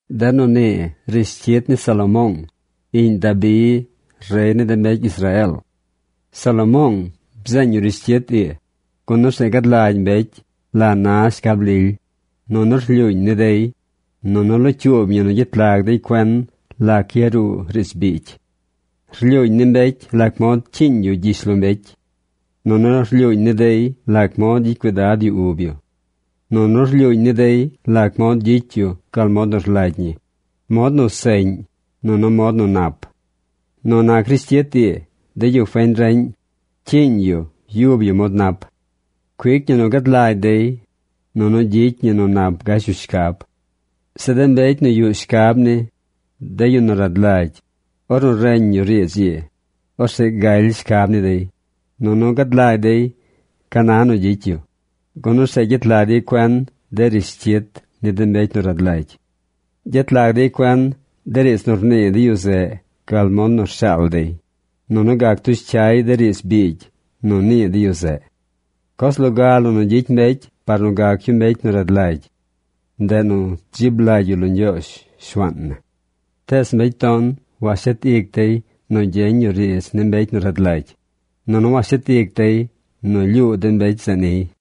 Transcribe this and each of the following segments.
De nu nii rishcyit ni Salomoong, iꞌñ Dabi, rey ni de mbecy Israeel. Salomoong bzeeñ yu rishcyit ii, gun orzeꞌ gad lagy mbecy la na shcab lily, nunu rlyuuñ ni dey, nunu locyuub ñi nu gyet lag dey cuen lac yaruu riidz biigy. Rlyuuñ ni mbecy lac mod cyiiñ yu gyishlombecy. Nunu rlyuuñ ni dey lac mod gyicy cuidad yu ub yu. Nunu rlyuuñ ni dey lac mod gyicy yu gal mod nu rlagy ñi, mod nu seꞌñ, nunu mod nu nap. Nu nac rishcyit ii, de yu feñ reꞌñ cyiiñ yu yub yu mod nap. Cuic ñi nu gad lagy dey, nunu gyicy ñi nu nap gash yu shcab. Zeꞌ de mbecy nu yuꞌ shcab ni, de yu nu rad lagy, ornu reñ yu riidz ii, orzeꞌ galy shcab ni dey, nunu gad lagy dey ca na nu gyicy yu, gun orzeꞌ gyet lag dey cuen de rishcyit ni de mbecy nu rad lagy. Gyet lag dey cuen de riidz nu rnii de yu zeꞌ gal mod nu rshaal dey, nunu gac tush cyay de riidz biigy nu nii de yu zeꞌ. Coz loga la nu gyicy mbecy par nu gac yu mbecy rad lagy, ndeꞌ nu dzib lagy yu lo Ñgyoozh, Shuaan na. Tees mbecy ton washet ic dey nu gyeñ yu riidz ni mbecy nu rad lagy, nunu washet ic dey nu lyuu de mbecy zeꞌ niy.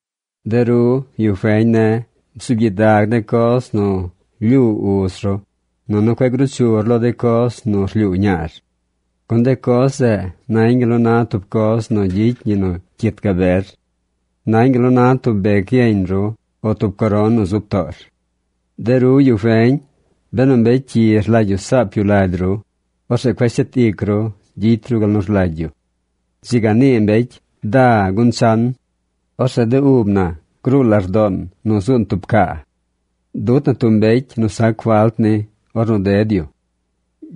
De ru, yu feñ ne̱, bzuub gyidag de coz nu lyuu uz ru, nunu cueꞌ gruu chur lo de coz nu rlyuu ñaar. Gun de coz zeꞌ nañ gal nu na tub coz nu gyicy ñi nu cyit gaber. Nañ gal nu na tub bec yeñ ru o tub coron nu zub toor. De ru, yu feñ, benu mbecy cyi rlagy yu saap yu lagy ru, orzeꞌ cueꞌ shet ic ru gyicy ru gal nu rlagy yu. Dzi ga nii mbecy: “Da gun chan. Orzeꞌ de ub na gruu lardoon nu zuun tub caa. Dut na tub mbecy nu sac falt ni ornu ded yu.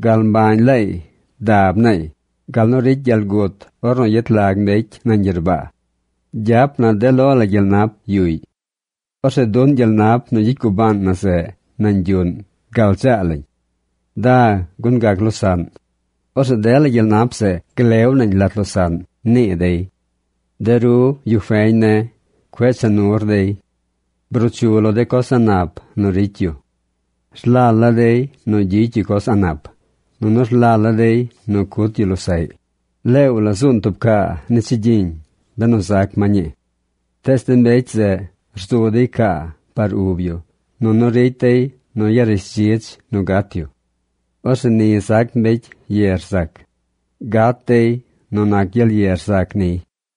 Gal mbañ laay dab naay gal nu ricy gyel gut ornu yet lag mbecy nañ gyerbaa. Gyap na de lo la gyel nap yuꞌy. Orzeꞌ duꞌn gyel nap nu gyicy gubaan na zeꞌ nañ yuꞌn gal dzaa lañ. Da gun gac losaꞌn. Orzeꞌ dela gyel nap zeꞌ glew nañ lat losaꞌn”, nii dey. De ru, yu feñ ne̱, cueꞌ cha nur dey. Bruu chu lo de coz a̱ꞌ nap nu ricy yu. ¡Rlal la dey nu gyicy yu coz a̱ꞌ nap! ¡Nunu rlal la dey nu cut yu losaꞌy! Leew la zuun tub caa ni chigyiñ, benu zac ma ñii. Tees de mbecy zeꞌ rzu dey caa par ub yu, nunu ricy dey nu yarishdzidz nu gat yu. Orzeꞌ ni zac mbecy ye rzac. Gat dey nu nac gyel ye rzac niy.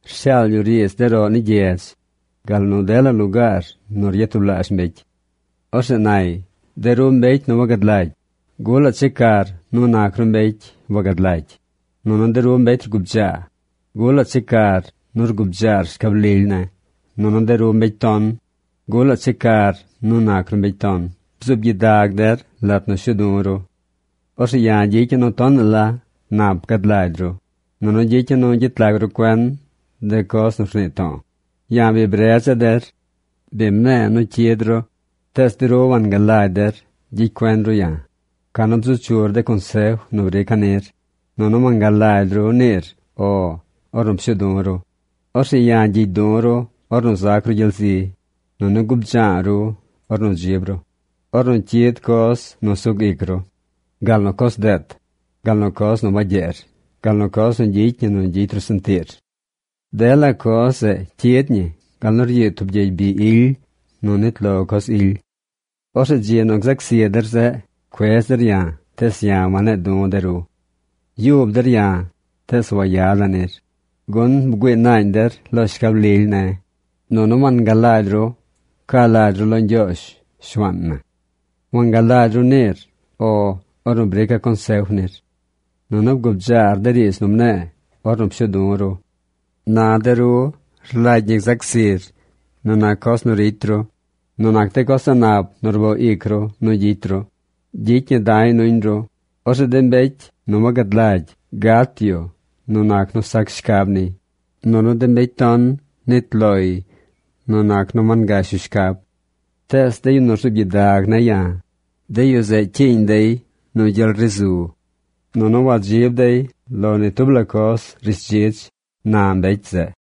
Rshaal yu riidz de roꞌ ni gyedz, gal nu dela lugaar nu ryatublaazh mbecy. Orzeꞌ nay: “De ru mbecy nu wagad lagy, ¿gulaꞌ checar nu nac ru mbecy wagad lagy? Nunu de ru mbecy rgubdzaa, ¿gulaꞌ checar nu rgubdzaar shcab lily ne̱? Nunu de ru mbecy ton, ¿gulaꞌ checar nu nac ru mbecy ton? Bzuub gyidag der lat nu shuu du̱ ru. Orzeꞌ ya̱ gyicya̱ nu tonaꞌ la nap gad lagy ru, nunu gyicya̱ nu gyet lag ru cuen de coz nu rnii to̱o̱. Ya̱ bi bredza̱ der. Bi mne̱e̱ nu cyid ru, tees de ru wangalagy der gyicy cuen ru ya̱, canu bzu chur de consef nu brica̱ nir, nunu wangalagy ru niir “O” ornu pshuu du̱ ru. Orzeꞌ ya̱ gyigy du̱ ru ornu zac ru gyel zi̱, nunu gubdza̱a̱ ru ornu dzib ru, ornu cyid coz nu sug ic ru, gal nu coz deet, gal nu coz nu wagyeer, gal nu coz nu gyicy ñi nu gyicy ru sentiir. Dela coz zeꞌ cyid ñi gal nu ryiid tub gyey bi ily nu nit lo coz ily. “Orzeꞌ dzi nu gzac zi der zeꞌ, cuedz der ya̱, tees ya̱ wane̱e̱ du̱ de ru. Yub der ya̱, tees wayada̱ nir, gun bgüii naañ der lo shcab lily ne̱, nunu wangalagy ru ca lagy ru lo Ñgyoozh Shuaan na. Wangalagy ru niir “O” ornu brica̱ consef nir. Nunu bgubdzaar de riidz nu mne̱e̱ ornu pshu̱u̱ du̱ ru. ¡Na de ru rlagy ñi gzac zir nu nac coz nu ricy ru! ¡Nu nac de coz a̱ꞌ nap nu rboo ic ru nu gyicy ru, gyicy ñi da̱y nuñ ru! Orzeꞌ de mbecy wagad lagy gat yu nu nac nu sac shcab niy, nunu de mbecy ton nit loy nu nac nu wangash yu shcab. Tees de yu nu rzuub gyidag ne̱ ya̱, de yu zeꞌ cyiiñ dey nu gyel ri zu. Nunu wadzib dey lo ni tub la coz rishdzidz”, na mbecy zeꞌ.